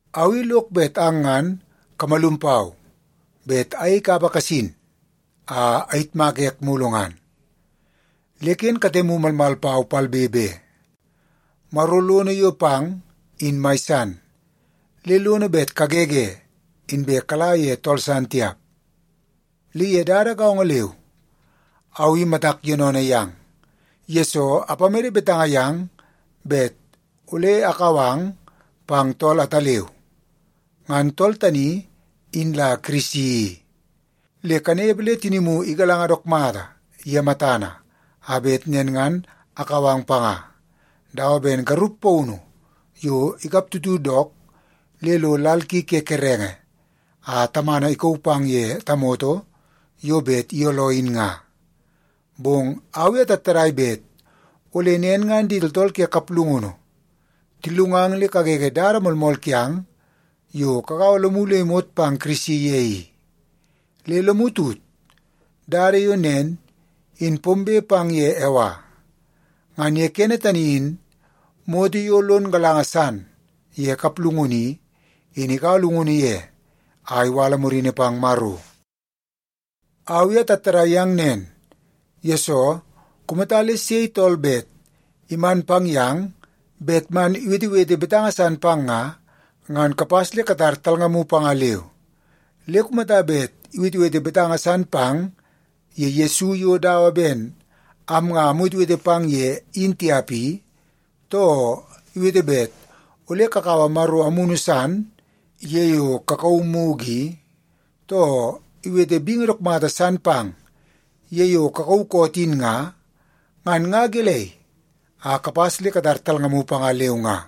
Au i lok bet ang ngan kamalum pau bet ayei kapa kasin a ayitmaka ek mulu ngan. Le ken katemu malmal pau palbe be. Maro lono yo pang in mai san, le lono bet kagege inbe kala ye tool san tiap. Le ye dada gaongo leu au i matak yoonoonoo yang, yesoo apamede betanga yang bet ole akau ang pang tool ataleu. Ngan tool tani in la Kirisi i. Le kanepe le tinimu igalanga dook mata ye matana, a bet nen ngan akau ang panga, dawa ben garup paunu yo ikap tutu dook le lo lal ki ke kerenge a tamana ikauu pang ye tamoto yo bet iyooloo in nga. Bong au i atattadai bet ole nen ngan di tooltool ke kaplungunu tillungang le kagege dada moolmool kiang yo kagaua lomu le imot pang Kirisi ye i. Le lomu tut, dada yo nen in pombe pang ye Ewa. Ngan ye kene tani in moto yo lon galanga san ye kaplungunu i, in ikaua llungunu ye a iwala murini pang Maro. Au i atattadai yang nen, yesoo kumata le sei tool bet iman pang yang bet man iwetewete betanga san pang nga, ngan kapas le katar talngamu panga leu. Le kumata bet iwetewete betanga san pang ye Yesu yo dawa ben am nga amwetewete pang ye in tiap i, too iwete bet ole kakaua maro amunu san ye yo kakauu mugu i, too iwete bingi dook mata san pang ye yo kakauu koot in nga, ngan nga gelei a kapas le katar talngamu panga leu nga.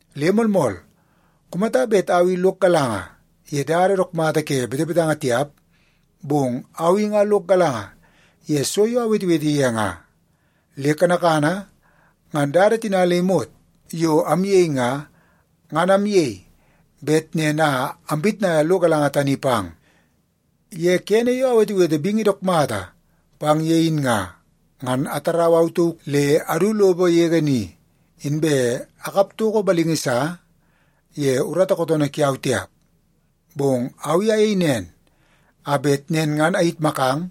Le moolmool, kumata bet au i lok galanga ye dada dook mata ke betebetanga tiap, bong au i nga lok galanga ye so yo awetewete ye nga. Le kanakana ngan dada tina le imot yo amyei nga, ngan amyei bet nen a ampitnaia lo galanga tani pang. Ye kene yo awetewete bingi dook mata pang ye in nga, ngan atarau au tauk le adu lopo yege ni, inbe akap toko balingi sa ye urata kootoonoo kiau tiap. Bong au i ayei nen a bet nen ngan ayitmakang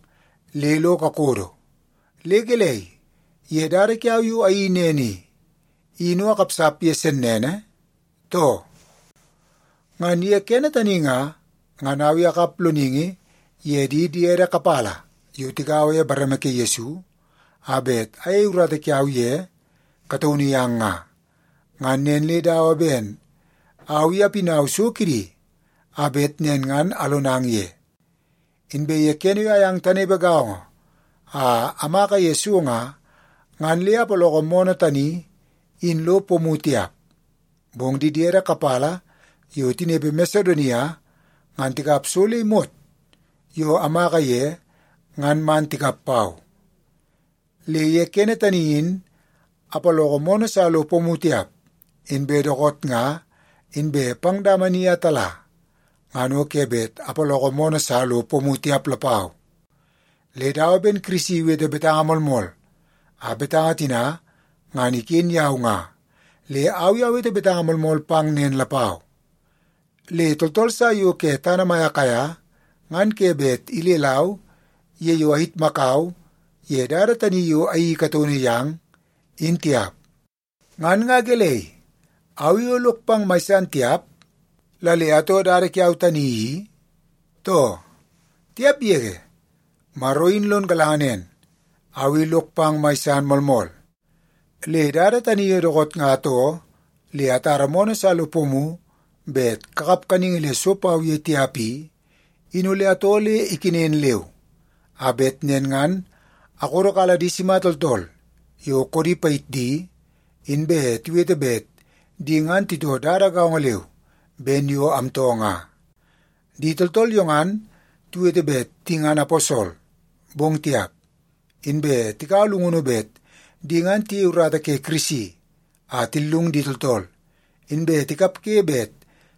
le lo kakodo. Le gelei, ye dada kiau yo ayeii nen i, in o akapsap ye sennene, too? Ngan ye kene tani nga, ngan au i akap loningi ye di diede kapala yo tigaua ye bareme ke Yesu a bet ayei urata kiau ye kataunu yang nga. Ngan nen le dawa ben au i apinau so kidi a bet nen ngan alonang ye. Inbe ye kene yo ayang tanepe gaongo a amaka ye so nga, ngan le apaloko moonoo tani in lo pomu tiap. Bong di diede kapala yo tinepe Masedonia ngan tikap so le imot yo amaka ye ngan man tikap pau. Le ye kene tani in apaloko moonoo sa lo pomu tiap, inbe dookoot nga inbe pang dama ni a tala, ngan o ke bet apaloko moonoo sa lo pomu tiap lapau. Le dawa ben Kirisi iwete betanga moolmool, a betanga tina ngan iken yau nga, le au i awete betanga moolmool pang nen lapau! Le tooltool sa yo ke tana mai Akaia ngan ke bet ilelau ye yo ayitmakau ye dada tani yo ayeii kataunu yang, in tiap. Ngan nga gelei, au i o lok pang mai san tiap la le atoo dada kiau tani i, too? Tiap yege, Maro in lon galanga nen, au i lok pang mai san moolmool! Le dada tani yo dookoot nga atoo le atara moonoo sa lo pomu bet kakap kaningi le so pau ye tiap i, in ole atoo le ikenen leu, a bet nen ngan akodokala di sima tooltool yo koodi payit di, inbe tiwete bet di ngan titoo dada gaongo leu ben yo amtoo nga. Di tooltool yo ngan tiwete bet di ngan aposol, bong tiap. Inbe tikaua llungunu bet di ngan tiyei urata ke Kirisi a tillungu di tooltool, inbe tikapge bet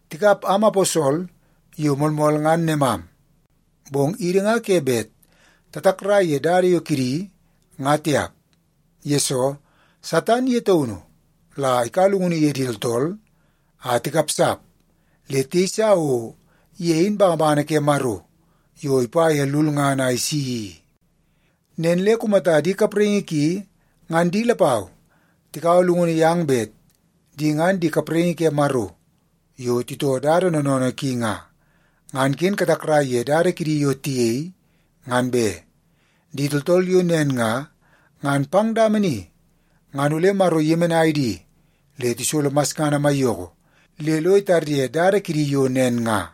tikap am aposol yo moolmool ngan nemam. Bong idi nga ke bet tatakrai ye dada yo kidi nga tiap, yesoo Satan ye taunu la ikaua llungunu ye di tooltool a tikapsap le tiyeisa o ye in bangabangana ke Maro yo ipa ye lulngana a isi i. Nen le kumata di kapraingi ki ngan di lapau tikaua llungunu yang bet di ngan di kapraingi ke Maro yo titoo dada noonoonoo ki nga, ngan ken katakrai ye dada kidi yo tiyei, ngan be. Di tooltool yo nen nga, ngan pang dama ni ngan ole Maro iyemenai di le tisolo masngana maiyoko le lo itarye dada kidi yo nen nga.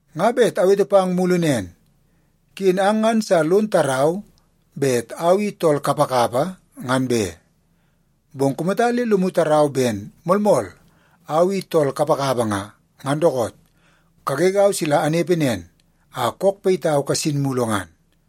Nga bet awete pang mulu nen; ken ang ngan sa lon tarau bet au i tool kapakapa, ngan be. Bong kumata le lomu tarau ben moolmool au i tool kapakapa nga, ngan dookoot, kagegau sila anepe nen a kook payitau kasin mulu ngan.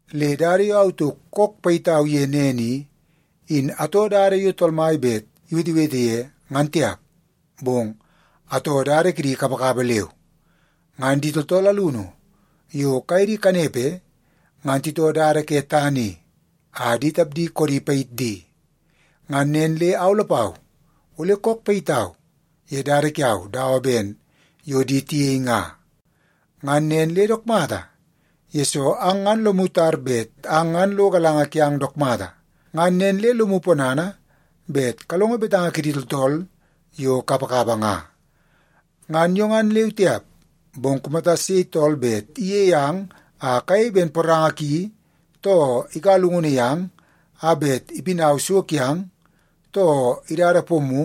Le dada yo au tauk kook payitau ye nen i, in atoo dada yo Tool Mai bet iwetewete ye, ngan tiap, bong atoo dada kidi kapakapa leu. Ngan di tooltool alunu yo kaye di kanepe, ngan titoo dada ke tana i a di tapdi koodi payit di. Ngan nen le au lapau, ole kook payitau ye dada kiau dawa ben yo di tiyei nga. Ngan nen le dook mata, yesoo ang ngan lomu tar bet ang ngan lo galanga kiang dook mata, ngan nen le lomu ponana bet kalongo betanga kidi tooltool yo kapakapa nga. Ngan yo ngan leu tiap, bong kumata sei tool bet iyei ang a kayei ben poranga ki, too ikaua llungunu yang a bet ipinau so kiang, too idada pomu,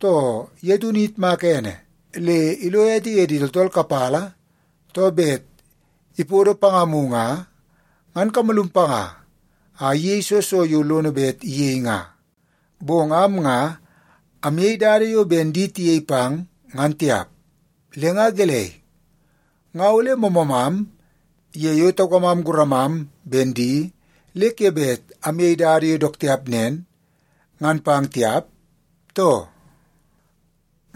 too ye taunu iyitmaka ene le ilo ete ye di tooltool kapala, too bet ipodo pangamu nga, ngan kamalum panga a iyei soo so yo lono bet iyei nga. Bong am nga amyei dada yo ben di tiyei pang, ngan tiap. Le nga gelei, nga ole moomoomam ye yo taukamam guramam ben di le ke bet amyei dada yo dook tiap nen, ngan pang tiap, too?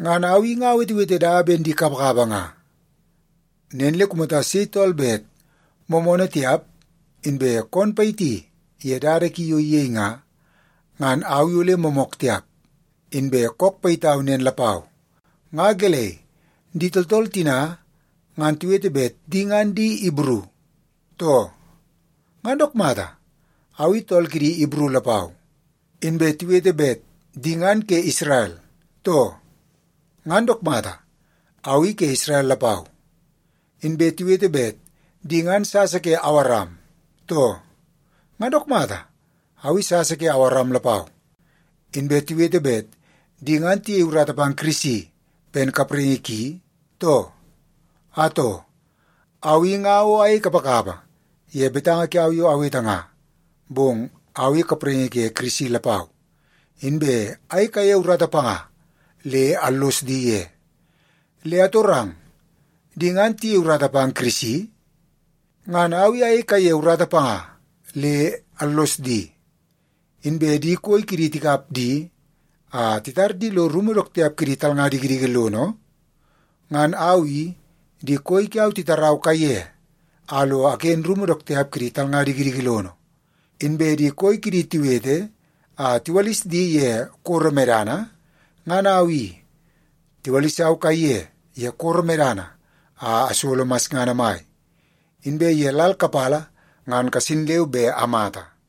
Ngan au i nga awetewete dawa ben di kapakapa nga. Nen le kumata sei tool bet moomoonoo tiap, inbe koon payiti ye dada ki yo iyei nga, ngan au i ole moomook tiap, inbe kook payitau nen lapau. Nga gelei, di tooltool tina ngan tiwete bet di ngan di Ibru, too? Ngan dook mata, au i tool kidi Ibru lapau. Inbe tiwete bet di ngan ke Isrel, too? Ngan dook mata, au i ke Isrel lapau. Inbe tiwete bet di ngan sasa ke Awaram, too? Ngan dook mata, au i sasa ke Awaram lapau. Inbe tiwete bet di ngan tiyei urata pang Kirisi ben kapraingi ki, too? Atoo, au i nga o ayei kapakapa ye betanga kiau yo awete nga, bong au i kapraingi ke Kirisi lapau, inbe ayei kaiye urata panga le allos di ye. Le atorang, di ngan tiyei urata pang Kirisi? Ngan au i ayei kaiye urata panga, le allos di. Inbe di koi kidi tikap di a titar di lo rumu dook tiap kidi talnga dikidiki lono? Ngan au i, di koi kiau titarau kaiye a lo aken rumu dook tiap ke di talnga dikidiki lono. Inbe di koi kidi tiwete a tiwalis di ye koro medana? Ngan au i, tiwalisau kaiye ye koro medana a asolo masngana mai, inbe ye lal kapala ngan kasin leu be amata.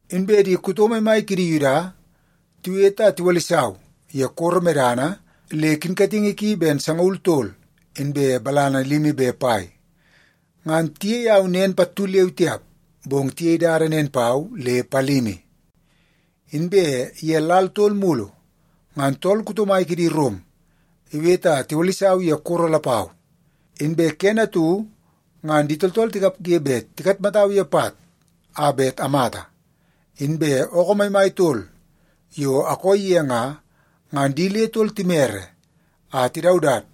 Inbe di kuto maimai kidi Yuda tiwete a tiwalisau ye koro medana le kinkatingi ki ben sangaul tol inbe balana limi be pai. Ngan tiyei au nen pattu leu tiap, bong tiyei dada nen pau le palimi. Inbe ye lal tol mulu, ngan tool kuto mai kidi Rom iwete a tiwalisau ye koro lapau. Inbe kene atu ngan di tooltool tikapge bet tikatmatau ye pat a bet amata. Inbe ookoo maimai tol yo akooi ye nga, ngan di le tol timere a tidaudat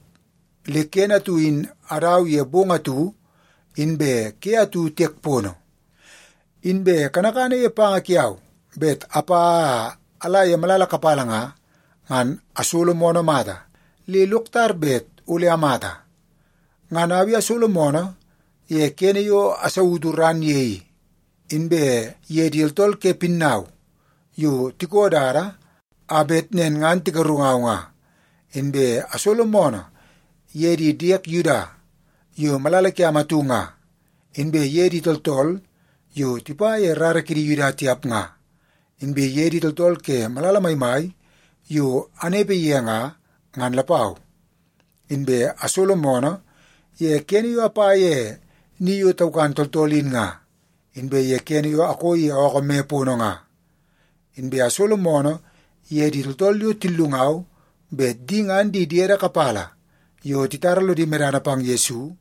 le kene atu in adau ye bong atu inbe ke atu tiek pono. Inbe kanakana ye panga kiau bet apa a ala ye malala kapala nga, ngan asolo moonoo mata le lok tar bet ole amata. Ngan au i asolo moonoo ye kene yo asautu ran ye i, inbe ye di tooltool ke pinnau yo tiko dada a bet nen ngan tigarungau nga. Inbe asolo moonoo ye di diek Yuda yo malala kiam atu nga, inbe ye di tooltool yo tipa ye rara kidi Yuda tiap nga, inbe ye di tooltool ke malala maimai yo anepe ye nga, ngan lapau. Inbe asolo moonoo ye kene yo apa ye ni yo taukan tooltool in nga, inbe ye kene yo akooi ye ookoo me pono nga. Inbe asolo moonoo ye di tooltool yo tillungau bet di ngan di diede kapala yo titara lodi medana pang Yesu,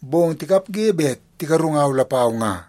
bong tikapge bet tigarungau lapau nga.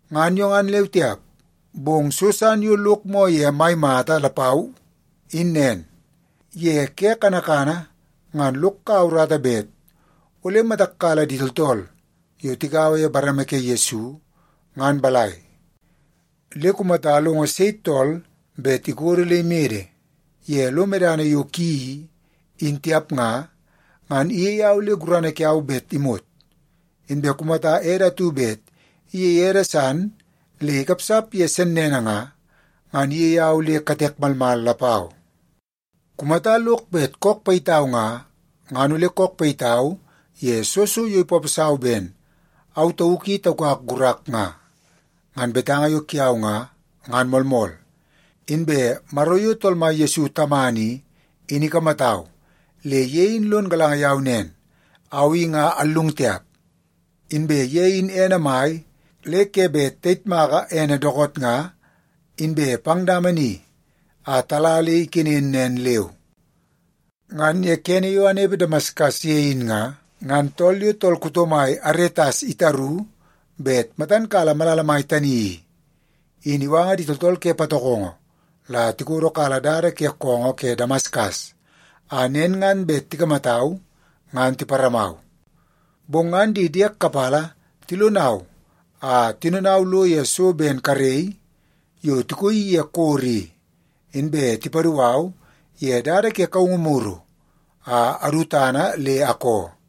Ngan yo ngan leu tiap, bong so san yo lok moo ye mai mata lapau in nen. Ye ke kanakana ngan lok kaua urata bet ole matak kala di tooltool yo tigaua ye bareme ke Yesu ngan balai. Le kumata alongo sei tool bet ikodo le imede ye lo medana yo ki i, in tiap nga, ngan iyei au le gurana kiau bet imot. Inbe kumata ede atu bet iyei ede san le ikapsap ye sennene nga, ngan iyei au le katek malmal lapau. Kumata lok bet le kook payitau nga, ngan ole kook payitau ye soo so yo ipaposau ben au tauk i taukak gurak nga. Ngan betanga yo kiau nga, ngan moolmool. Inbe Maro yo Tool Mai Yesu Tamana i, in ikamatau le ye in lon galanga yau nen, au i nga allung tiap. Inbe ye in ene mai le ke bet tayitmaka ene dookoot nga inbe pang dama ni a tala le ikenen nen leu. Ngan ye kene yo anepe Damaskas ye in nga, ngan tool yo tool kuto mai Aretas itaru bet matan kala malala mai tani i, in iwanga di tooltool ke patokongo la tikodokala dada ke koongoo ke Damaskas, a nen ngan bet tikamatau ngan tiparamau. Bong ngan di diek kapala tilonau a tinonau lo ye so ben karei yo tikoii ye koro i, inbe tipadu au ye dada ke kaungu muru a adu tana le akoo.